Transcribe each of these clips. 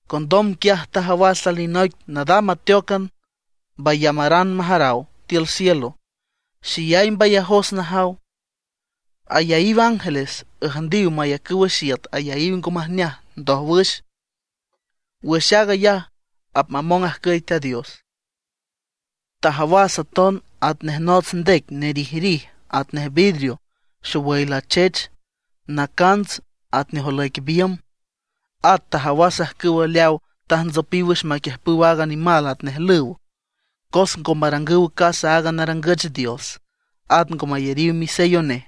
Condom quiaj tajawas alinoic nadam ateócan mbayamaran majaraw tiül cielo, xeyay mbayajos najaw: Ayaíw ángeles üjndiw mayacüw wüx iüt ayaíw ngo majneaj ndójwüx. Wüx aag ayaj apmamong ajcüy Teat Dios. Tajawas aton atnej nots ndec nerijrij atnej vidrio xowüy lachech, nacants atnej olüic biümb. At tajawas ajcüwa leaw tajntsopiw wüx maquiüjpüw aaga nimal atnej lüw, cos ngo marangüw casa aaga narangüch dios, at ngo mayariw misello nej,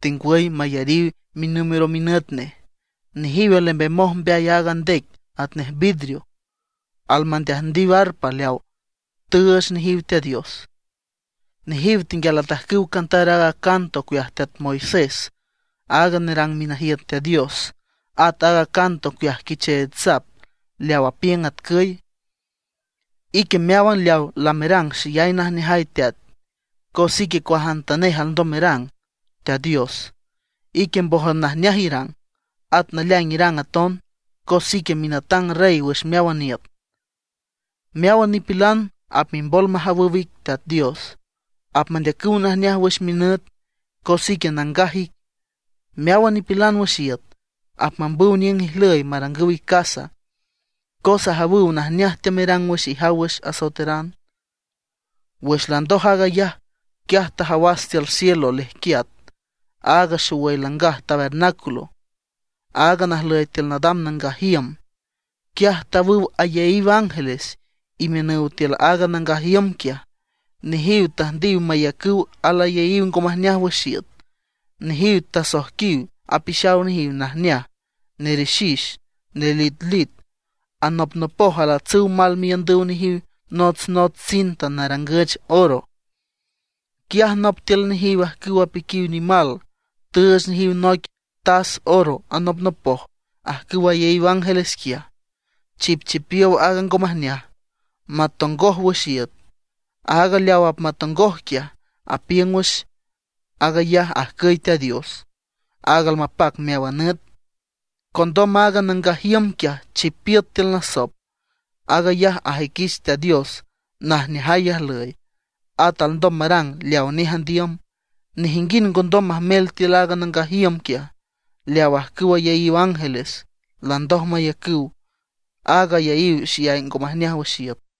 tengwüy mayariw minúmero minüt nej. Nejiw alembemoj mbeay aaga ndec atnej vidrio, almandeajndiw arpa leaw tüüch nejiw Teat Dios. Nejiw tenguial atajcüw cantar aaga canto ocueaj teat Moisés, aaga nerang minajiüt Teat Dios, at aaga canto ocueaj Quicheech Sap, leaw apiüng atcüy: Ique meáwan leawa lamerang xeyay najneajay, teat, cos ique cuajantanej alndom merang, Teat Dios; ique mbójan najneaj irang, at naleaing irang aton, cos ique minatang Rey wüx meáwan iüt. Meáwan nipilan apmimbol majawüw ic, Teat Dios. Apmandeacüw najneaj wüx minüt, cos ique nangaj ic. Meáwan nipilan wüx iüt apmambüw niüng ijlüy marangüw ic casa, cos ajawüw najneaj teamerang wüx ijaw wüx asoeteran. Wüx landoj aag ayaj, quiaj tajawas tiül cielo lejquiat aaga xowüy langaj tabernáculo, aaga najlüy tiül nadam nangaj iüm. Quiaj tawüw ayaíw ángeles imiünüw tiül aaga nangaj iüm quiaj. Nejiw tüjndiw mayacüw alayaíw ngo majneaj wüx iüt. Nejiw asoijquiw apixaw nejiw najneaj, nerixix, nelitlit. Anopnopoj alatsüw mal miiündüw nejiw notsnots cinta narangüch oro. Quiaj nop tiül nejiw ajcüw apiquiw nimal tüüch nejiw noic tas oro anopnopoj ajcüw ayaíw ángeles quiaj, chipchipiow aaga ngo majneaj; apmatongoj wüx iüt. Aaga leaw apmatongoj quiaj, apiüng wüx aag ayaj ajcüy Teat Dios, aaga almapac meáwan nüt. Condom aaga nangaj iüm quiaj chipiüt tiül nasop. Aag ayaj ajüiquich Teat Dios najneajay ajlüy, at alndom marang leawa nej andiüm. Nejinguind ngo ndom majmel tiül aaga nangaj iüm quiaj, leaw ajcüw ayaíw ángeles landoj mayacüw aaga ayaíw xeyay ngo majneaj wüx iüt.